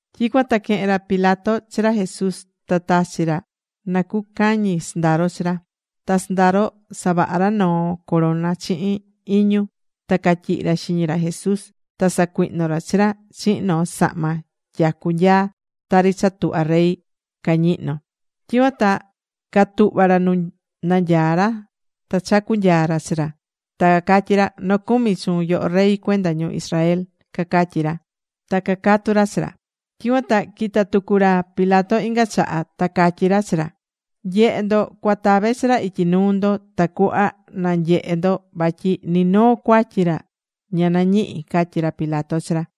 Tyicuan ta quehe̱n ra Pilato chi ra Jesús ta tachi̱ ra na cucañi sɨndaro chi ra. Ta sɨndaro savaha̱ ra noo corona chihin iñu ta catyihi̱ ra xiñi ra Jesús. Ta sacuihno̱ ra chi ra chihin noo sahma tyacu nyaa tari cha tuhvá rey cañihnó. Tyicuan ta catuhva̱ ra nu nanyaá ra ta chacú nyaa ra chi ra, ta cacatyí ra: ―¡Nocumi chuun yoho Rey cuenda ñu Israel! ―cacatyí ra, ta cacatu̱ ra chi ra. Tyicuan ta quita̱ tucu ra Pilato inga chaha ta catyí ra chi ra: ―Nye̱he ndo cuatave chi ra ityi nuu ndo tacuhva nanyehe ndo vatyi ni noo cuatyi ra ña nañihi̱ ―catyí ra Pilato chi ra.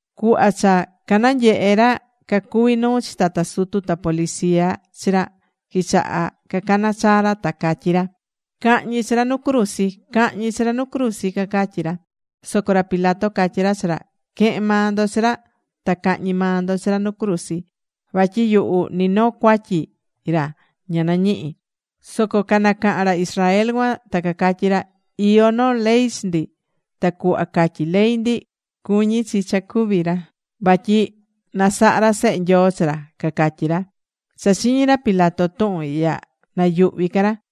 Cuhva cha cananyehe ra cacuví nuu chi tata sutu ta policía chi ra, quichaha̱ cacana chaa ra ta catyí ra: ―¡Ca̱hñi chi ra nu cruzi! ¡Ca̱hñi chi ra nu cruzi! ―cacatyí ra. Soco ra Pilato catyí ra chi ra: ―Que̱hen maa ndo chi ra ta ca̱hñi maa ndo chi ra nu cruzi. Vatyi yuhu ni noo cuatyi ra ña nañihí. Soco nacaha̱n ra Israel cuan ta cacatyí ra: ―Iyó noo ley chi ndi, ta cuhva catyí ley ndi, cuñí chi cha cúvi ra vatyi nasahá ra Sehe Nyoo chi ra ―cacatyí ra. Cha chiñi̱ ra Pilato tuhun ihya, nayuhví ca ra.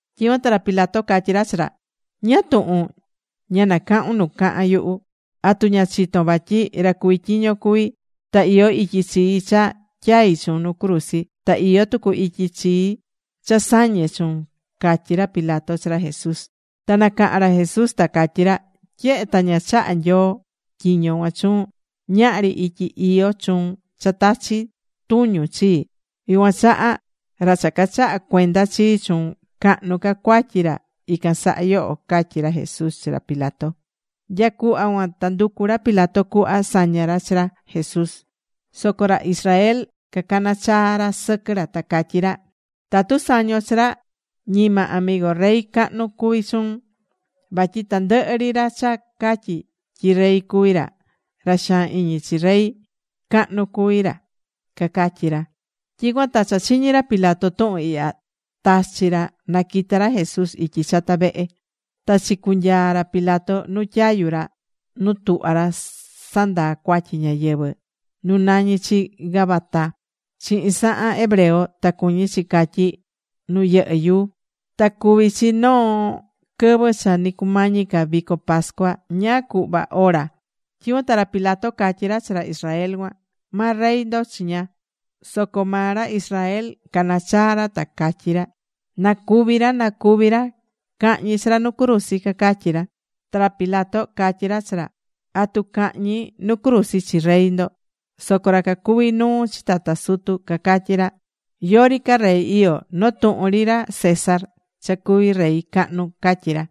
Tyicuan ta ra Pilato catyí ra chi ra: ―¿Ñáá tuhun ña nacahún nu cahán yuhu? ¿Atu ña chitón vatyi ra cuví tyiño cuví ta iyó ityi chii cha tyai chuun nu cruzi, ta iyó tucu ityi chii cha sañe chuun? ―catyí ra Pilato chi ra Jesús. Ta nacaha̱n ra Jesús ta catyí ra: ―Tyehe ta ña chaha̱ Nyoo tyiño cuan chuun, ñahri ityi iyó chuun cha tachi tuñun chii. Yucuan chaha, ra cha cachaha̱ cuenda chii chuun, cahnu ca cuatyi ra ican saha yoho ―catyí ra Jesús chi ra Pilato. Nya cuhva cuan ta nducu̱ ra Pilato cuhva saña ra chi ra Jesús, soco ra Israel cacana̱ chaa ra sɨquɨ ra, ta catyí ra: ―¡Tatu sañon chi ra, ñima amigo rey cahnu cuví chuun! Vatyi tandɨhɨ ri ra cha catyí tyi rey cuví ra, ra xaan iñi chi rey cahnu cuví ra ―cacatyí ra. Tyicuan ta cha chiñi̱ ra Pilato tuhun ihya, tachi̱ ra na quita ra Jesús ityi chata vehe. Ta chicunyaa̱ ra Pilato nu tyayu ra nu tuhvá ra sandaa cuatyi ñáyɨvɨ nu nañí chi Gabata chihin sahan hebreo, ta cuñí chi catyí: “Nu yɨhɨ́ yuu”. Ta cuví chi noo quɨvɨ cha ni cumañi ca vico pascua, ñáá cuhva ora. Tyicuan ta ra Pilato catyí ra chi ra Israel cuan: ―¡Ma rey ndo chiña! Soco maa ra Israel canachaa̱ ra ta cacatyí ra: ―¡Na cúvi ra! ¡Na cúvi ra! ¡Ca̱hñi chi ra nu cruzi! ―cacatyí ra. Ta ra Pilato catyí ra chi ra: ―¿Atu cahñi nu cruzi chi rey ndo? Soco ra cacuví nuu chi tata sutu cacatyí ra: ―Yori ca rey iyó. Noo tuhun ri ra César, cha cuví rey cahnu ―catyí ra.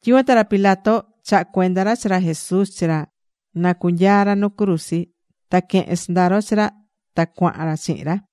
Tyicuan ta ra Pilato chaha̱ cuenda ra chi ra Jesús chi ra na cunyaa ra nu cruzi. Ta quehe̱n sɨndaro chi ra, ta cuahan ra chihin ra.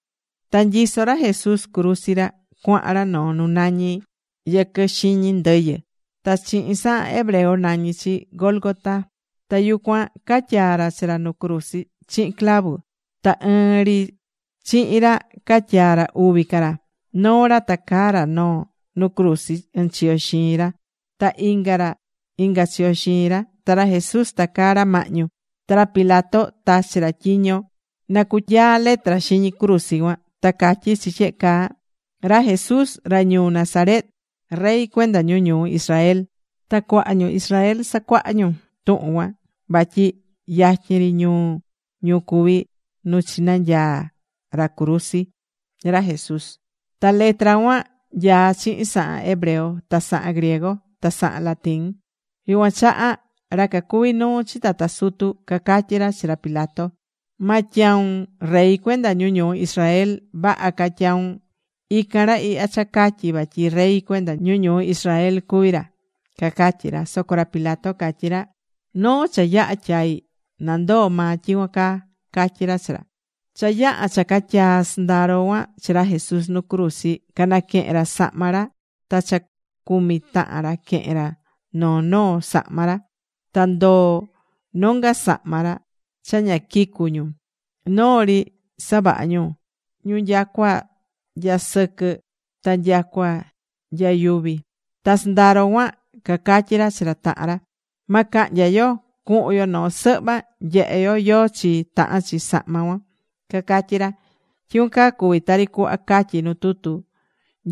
Ta nyisó ra Jesús cruzi ra, cuahan ra noo nu nañí: “Yɨquɨ Xiñi Ndɨyɨ”. Ta chihin sahan hebreo nañí chi Gólgota. Ta yucuan catyaa̱ ra chi ra nu cruzi chihin clavu. Ta ɨɨn ri chihin ra catyaa̱ ra uvi ca ra. Noo ra tacaá ra noo nu cruzi ɨnchiyo xiin ra ta inga ra inga chiyo xiin ra. Ta ra Jesús tacaá ra mahñu. Ta ra Pilato tachi̱ ra tyiño na cunyaa letra xiñi cruzi cuan. Ta catyí chi tyehe caa: “Ra Jesús ra ñuu Nazaret, Rey cuenda ñu ñuu Israel.” Ta cuaha ñu Israel sacuaha̱ ñu tuhun cuan, vatyi yatyin ri ñuu ñu cuví nu chinanyaa̱ ra cruzi ra Jesús. Ta letra cuan nyaá chihin sahan hebreo, ta sahan griego, ta sahan latín. Yucuan chaha ra cacuví nuu chi tata sutu cacatyi̱ ra chi ra Pilato: ―Ma tyaun: “Rey cuenda ñu ñuu Israel”, vaha ca tyaun: “Ican ra ihya cha catyí vatyi rey cuenda ñu ñuu Israel cuví ra” ―cacatyí ra. Soco ra Pilato catyí ra: ―Noo cha yaha̱ tyai̱, nandoo maa tyicuan caa ―catyí ra chi ra. Cha yaha̱ cha catyaa̱ sɨndaro cuan chi ra Jesús nu cruzi, canaquehe̱n ra sahma ra ta cha cumi tahan ra quehe̱n ra noo noo sahma ra. Ta ndoo̱ nonga sahma ra cha ña quicu̱ ñu. Noo ri savaha̱ ñu nyacua nya sɨquɨ ta nya yuvi. Ta sɨndaro cuan cacatyí ra chi ra tahan ra: ―Ma cahnya yo. Cu̱hun yo noo sɨhva, nyehe yo yóó chi tahán chi sahma cuan ―cacatyí ra. Tyicuan caa cuvi̱ tari cuhva catyí nu tutu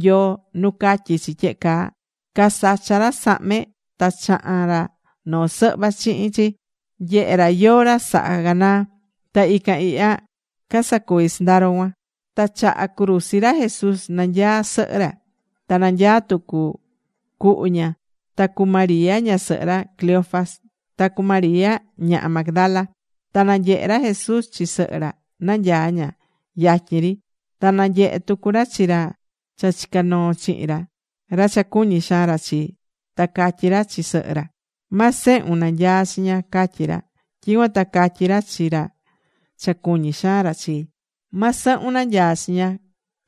Nyoo nu catyí chi tyehe caa: “Casacha̱ ra sahme ta chaha̱n ra noo sɨhva chihin chi, nyehe̱ ra yóó ra saha canaa.” Ta ican ihya casacuvi̱ sɨndaro cuan. Ta chaha cruzi ra Jesús nanyaá sɨhɨ ra. Ta nanyaá tucu cuhu ña, ta cu María ñasɨhɨ ra Cleofas, ta cu María ñaha Magdala. Ta nanyehe̱ ra Jesús chi sɨhɨ ra, nanyaá ña yatyin ri. Ta nanyehe̱ tucu ra chi ra cha chica̱ noo chihin ra, ra cha cuñí xaan ra chi. Ta catyí ra chi sɨhɨ ra: ―Ma sehun nanyaá chiña ―catyí ra. Tyicuan ta catyí ra chi ra cha cuñí xaan ra chi: ―Ma sɨhun nanyaá chiña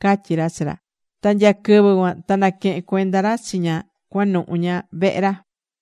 ―catyí ra chi ra. Ta nya quɨvɨ cuan ta naquehe̱n cuenda ra chi ña cuanuhu ña vehe ra.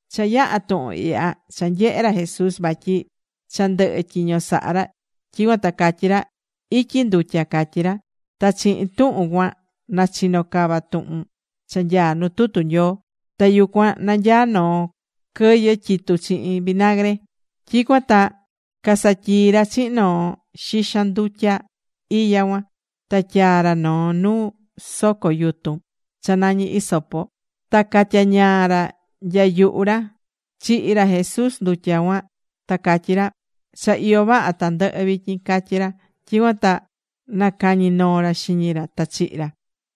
Cha yaha̱ tuhun ihya, cha nyehe̱ ra Jesús vatyi cha ndɨhɨ̱ tyiño saha ra. Tyicuan ta catyí ra: ―Ityi ndutya ―catyí ra. Ta chihin tuhun cuan nachino cava tuhun cha nyaá nu tutu Nyoo. Ta yucuan nanyaá noo quɨyɨ tyitú chihin vinagre. Tyicuan ta casatyii̱ ra chihin noo xixan ndutya iya cuan. Ta tyaa̱ ra noo nu soco yutun cha nañí hisopo, ta catyañaa̱ ra nya yuhu ra. Chihi̱ ra Jesús ndutya cuan ta catyí ra: ―Cha iyó vaha tandɨhɨ vityin ―catyí ra. Tyicuan ta nacañi̱ noo ra xiñi ra ta chihi̱ ra.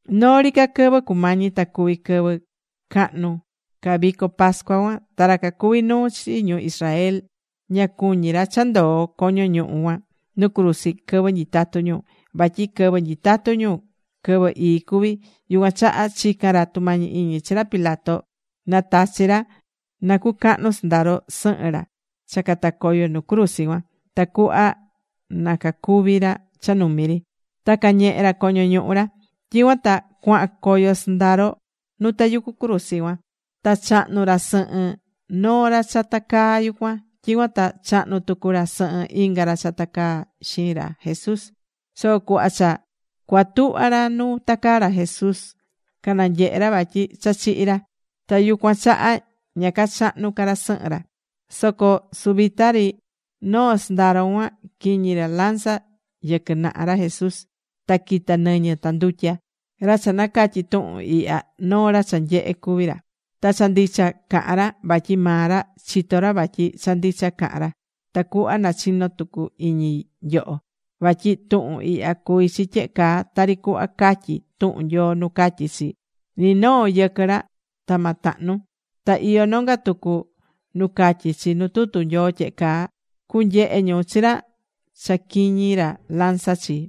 Noo ri ca quɨvɨ cumañi ta cuvi quɨvɨ cahnu ca vico pascua cuan, ta ra cacuví nuu chi ñu Israel ña cuñí ra cha ndoo coño ñuhu cuan nu cruzi quɨvɨ nyitatú ñu, vatyi quɨvɨ nyitatú ñu quɨvɨ ii cuví. Yucuan chaha chica̱n ra tumañi iñi chi ra Pilato na tachi ra na cucahnu sɨndaro sɨhɨn ra cha catacoyo nu cruzi cuan tacuhva na cacúvi ra cha numi ri, ta cañehe ra coño ñuhu ra. Tyicuan ta cuahan coyo sɨndaro nu tayucú cruzi cuan. Ta chahnu̱ ra sɨhɨn noo ra cha tacaá yucuan. Tyicuan ta chahnu̱ tucu ra sɨhɨn inga ra cha tacaa xiin ra Jesús. Soco cuhva cha cuatuhva ra nu tacaá ra Jesús, cananyehe̱ ra vatyi cha chihi̱ ra. Ta yucuan chaha ña cachahnu̱ ca ra sɨhɨn ra. Soco suvita ri noo sɨndaro cuan quiñi̱ ra lanza yɨquɨ naha ra Jesús. Ta quita̱ nɨñɨ ta ndutya. Ra cha nacatyí tuhun ihya, noo ra cha nyehe̱ cuví ra. Ta cha ndicha cahán ra, vatyi maa ra chitó ra vatyi cha ndicha cahán ra, tacuhva nachino tucu iñi nyoho. Vatyi tuhun ihya cuvi̱ chi tyehe caa tari cuhva catyí tuhun Nyoo nu catyí chi: “Ni noo yɨquɨ ra ta ma tahnu.” Ta iyó nonga tucu nu catyí chi nu tutu Nyoo tyehe caa: “Cunyehe ñu chi ra cha quiñi̱ ra lanza chi.”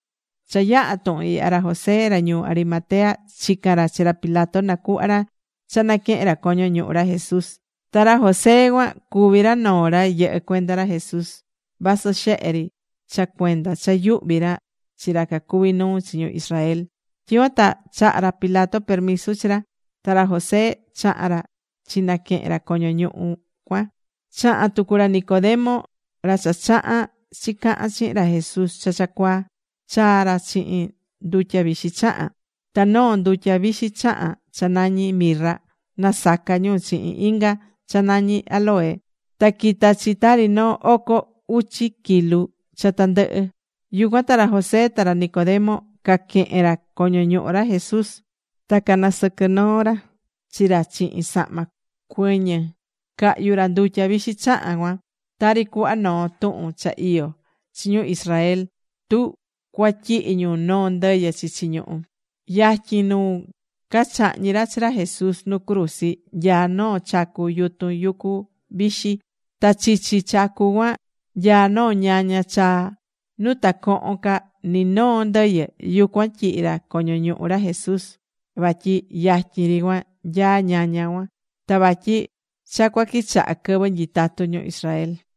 Cha yaha̱ tuhun ihya, ra José ra ñuu Arimatea chica̱n ra chi ra Pilato nacuhva ra cha naquehen ra coño ñuhu ra Jesús. Ta ra José cuan cuví ra noo ra yɨhɨ́ cuenda ra Jesús vasɨ xehe ri cha cuenda cha yuhví ra chi ra cacuví nuu chi ñu Israel. Tyicuan ta chaha̱ ra Pilato permisu chi ra, ta ra José chaha̱n ra chinaquehe̱n ra coño ñuhu cuan. Chaha̱n tucu ra Nicodemo, ra cha chaha̱n chicaha̱n chihin ra Jesús cha cha cuaa. Chaa̱ ra chihin ndutya vixi chahán. Ta noo ndutya vixi chahán cha nañí mirra nasaca̱ ñu chihin inga cha nañí áloe. Ta quita̱ chi tari noo oco uchi kilu cha tandɨhɨ. Yucuan ta ra José ta ra Nicodemo caquehe̱n ra coño ñuhu ra Jesús ta canasɨquɨ̱ noo ra chi ra chihin sahma cuɨñɨ cahyu̱ ra ndutya vixi chahán cuan, tari cuhva noo tuhun cha iyó chi ñu Israel tu cuatyihi ñu noo ndɨyɨ chichi ñuhú. Yatyin nu cachahñi̱ ra chi ra Jesús nu cruzi nyaá noo chacu yutun yucu vixi. Ta chichi chacu cuan nyaá noo ñaña chaa nu ta cohon ca ni noo ndɨyɨ. Yucuan tyihi̱ ra coño ñuhu ra Jesús vatyi yatyin ri cuan nyaá ñaña cuan ta vatyi cha cua quichaha quɨvɨ nyitatú ñu Israel.